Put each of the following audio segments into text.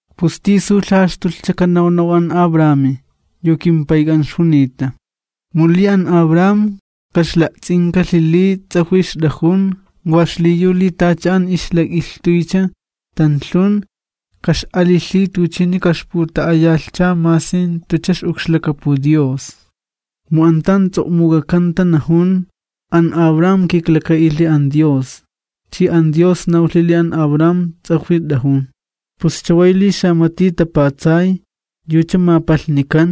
¿Pus tisu lhajaxtulhcha kanawnaw an Abrahami, yu kimpayk'an ixjunita? Mu li an Abraham kaxla'ts'inkalhi li ts'ajwi ixt'ajun wa xliyu li tacha an ixlak'ilhtuycha tanlhun, kax'alilhi tuchini kaxputa'ayalhcha masi jantucha ix'ukxlakapu Dios. Mu an tan ts'o'muk'akanta najun: “An Abraham kiklaka'ilhi an Dios, chi an Dios nawlhi li an Abraham ts'ajwi t'ajun.” Pus chaway, li xamati tapatsay, yucha mapalhnikan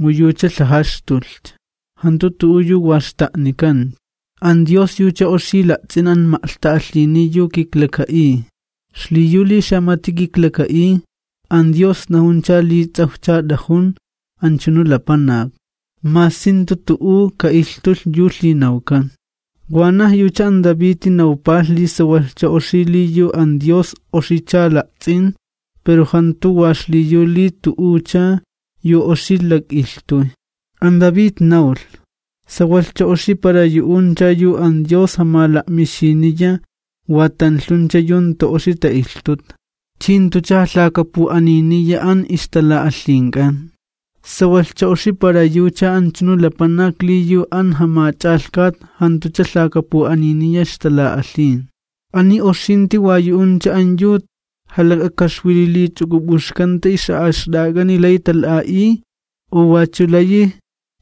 mu yucha lhajaxtulhcha, jantu tu'u yu wa xta'nikancha. An Dios yucha oxi la'ts'in an ma'lhta'alhini yu kiklaka'iy, xliyu li xamati kiklaka'iy, an Dios najuncha li ts'awjcha t'ajun anchunu lapanak, masi jantu tu'u ka'ilhtulh yu lhinawkan. Wanaj yucha an Daviti nawpalh li sawalhcha oxi li yu an Dios oxicha la'ts'in, pero jantu wa xliyu li tu'ucha yu oxicha lak'ilhtuy. An David nawlh: ¡Sawalhcha oxi para yu'uncha yu an Dios jamala'mixiniya wa tanlhuncha yu jantu oxi ta'ilhtuta, chi jantucha jalhakapu'aniniya an ixtala'alhink'an! Sawalhcha oxi para yucha anchunu lapanak li yu an Jamach'alhkat jantucha lhakapu'aniniya ixtala'alhin. ¿Ani oxinti wa yu'uncha an yu jalak'akaxwililich'uk'up'uxkanta ix'a'axt'a'ak'ani lay tala'a'iy u wachu layi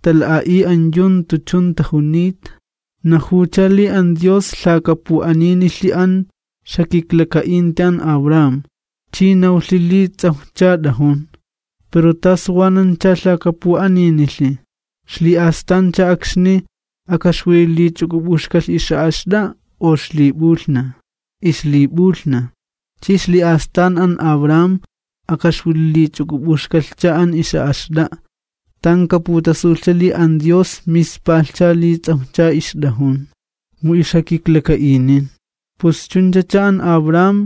tala'a'iy an yu jantu chun tajunita? Najuwcha li an Dios lhakapu'aninilhi an ixjakiklaka'inti an Abraham, chi nawlhcha li ts'awjcha t'ajun. Pero, ¿tasu wanancha lhakapu'aninilhi? ¿Xli'astancha akxni akaxwililich'uk'up'uxkalhcha ix'a'axt'a'a u ixlip'ulhnaj? Ixlip'ulhnaj. Chi ixli'astan an Abraham akaxwililich'uk'up'uxkalhcha an ix'a'axt'a'a, tan kaputasulhcha li an Dios mispalhcha li ts'awjcha ixt'ajun, mu ixjakiklaka'inin. Pus chunchacha an Abraham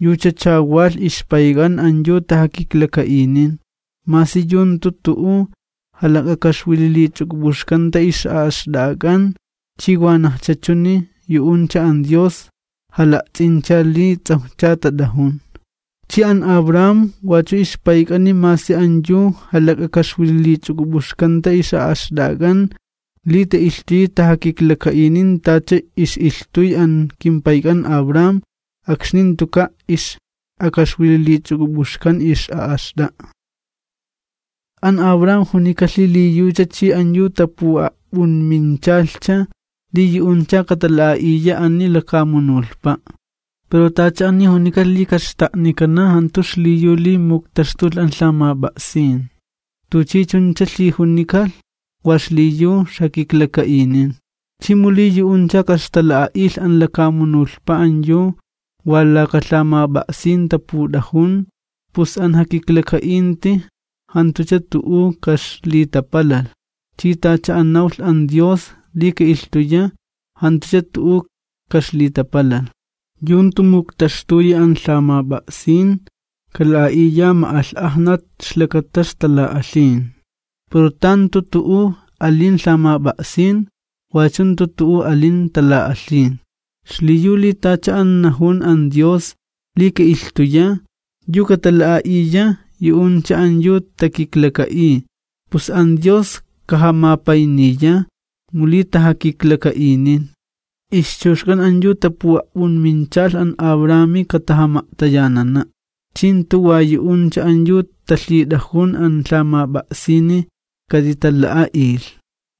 yuchacha walh ixpayk'an an yu tajakiklaka'inin, masi yu jantu tu'u jalak'akaxwililich'uk'up'uxkanta ix'a'axt'a'ak'an. Chi wanajcha chuni yu'uncha, an Dios jala'ts'incha li ts'awjcha tat'ajun. Chi an Abraham wachu ixpayk'ani masi an yu jalak'akaxwililich'uk'up'uxkanta ix'a'axt'a'ak'an li ta'ilhtuyi tajakiklaka'inin tacha ix'ilhtuy an kimpayk'an Abraham akxni jantuka' ix'akaxwililich'uk'up'uxkan ix'a'axt'a'a. An Abraham junikalh li yucha chi an yu tapu'a'p'unminchalh, li yu'uncha katala'a'iya ani lakamunulhpa'. Pero tacha ani junikalh li kaxta'nikana jantu xliyu li muktaxtulh an lhamap'a'sin, tuchi chuncha lhijunikalh wa xliyu ixjakiklaka'inin. Chi mu li yu'uncha kaxtala'a'ilh an lakamunulhpa an yu wa laka lhamap'a'sin taput'ajun, pus an jakiklaka'inti jantucha tu'u kaxlitapalalh, chi tacha an nawlh an Dios li ka'ilhtuya, wachu jantucha tu'u kaxlitapalalh. Yu jantu muktaxtuyi an lhamap'a'sin kala'a'iya ma'alh'ajnat ixlakata ixtala'alhin, pero tan jantu tu'u ali'in lhamap'a'sin, wachu jantu tu'u alin tala'alhin. Xliyu li tacha an najun an Dios li ka'ilhtuya, yu katala'a'iya yu'uncha an yu takiklaka'iy, pus an Dios kajamapayniya mu li tajakiklaka'inin. Ixchuxk'an an yu tapu'a'p'unminchalh an Abrahami katajama'tayanana', chi jantu wa yu'uncha an yu talhit'ajun an lhamap'a'sini katitala'a'ilh,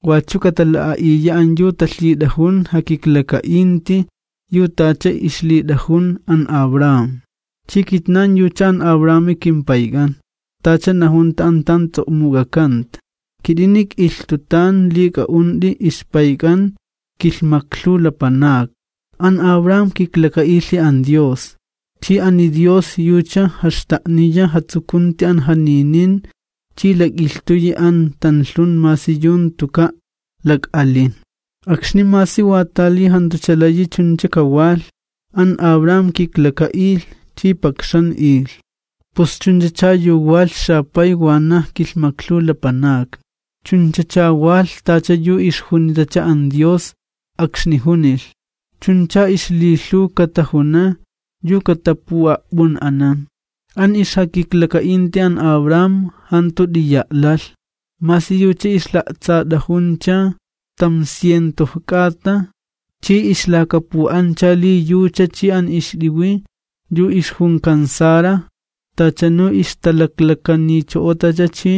wachu katala'a'iya an yu talhit'ajun jakiklaka'inti yu tacha ixlit'ajun an Abraham. Chi kitnan yucha an Abrahami kimpayk'an. Tacha najunta an tan ts'o'muk'akanta: “Kit'ini k'ilhtutan li k'a'unt'i ixpayk'an kilhmaklhuw lapanakni.” An Abraham kiklaka'ilhi an Dios, chi ani Dios yucha jaxta'niya jatsukunti an janinin chi lak'ilhtuyi an tanlhun masi yu jantuka' lak'alin. Akxni masi watali jantucha layi chuncha kawalh, an Abraham kiklaka'ilh chi pakxan'ilh, pus chunchacha yu pujunlhi “xapay wanaj kilhmaklhuw lapanakni”, chunchacha walh tacha yu ixjunitacha an Dios akxni junilh: “Chuncha ixlilhuw katajuna yu katapu'a'p'un'anan.” An ixjakiklaka'inti an Abraham jantu t'iya' lalh, masi yucha ixla'tsat'ajuncha tamciento k'ata chi ixlakapu'ancha li yucha chi an ixt'iwi yu ixjunkan Sara tachanu ixtalaklakanicho'otacha chi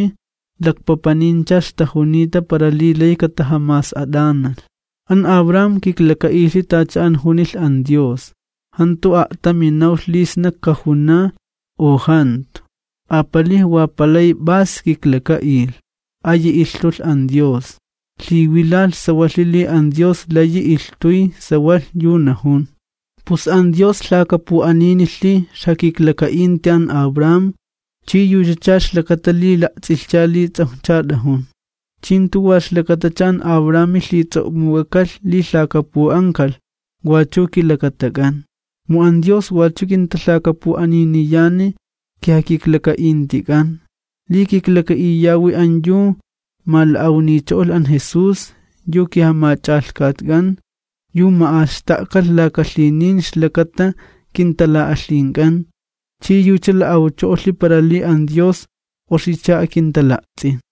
lakpapanincha ixtajunita para li lay katajamas'at'analh. An Abraham kiklaka'ilhi tacha an junilh an Dios, jantu a'tami nawlh li sna kajuna u jantu, apalij wa palay p'as kiklaka'ilh, ayi ilhtulh an Dios. Lhiwilalh sawalhi li an Dios layi ilhtuy sawalh yu najun. Pus an Dios lhakapu'aninilhi ixjakiklaka'inti an Abraham chi yuchacha ixlakata li la'ts'ilhcha li ts'awjcha t'ajun. Chi jantu wa ixlakatacha an Abrahami lhits'o'muk'akalh li lhakapu'ankalh, wachu kilakatak'an. Mu an Dios wachu kintalhakapu'aniniyani kijakiklaka'intik'an, li kiklaka'iyawi an yu mala'awnicho'olh an Jesús, yu kiJamach'alhkatk'an, yu ma'axta'kalh laka lhinin ixlakata kintala'alhink'an, chi yucha la'awcho'olhi para li an Dios oxicha akintala'ts'in.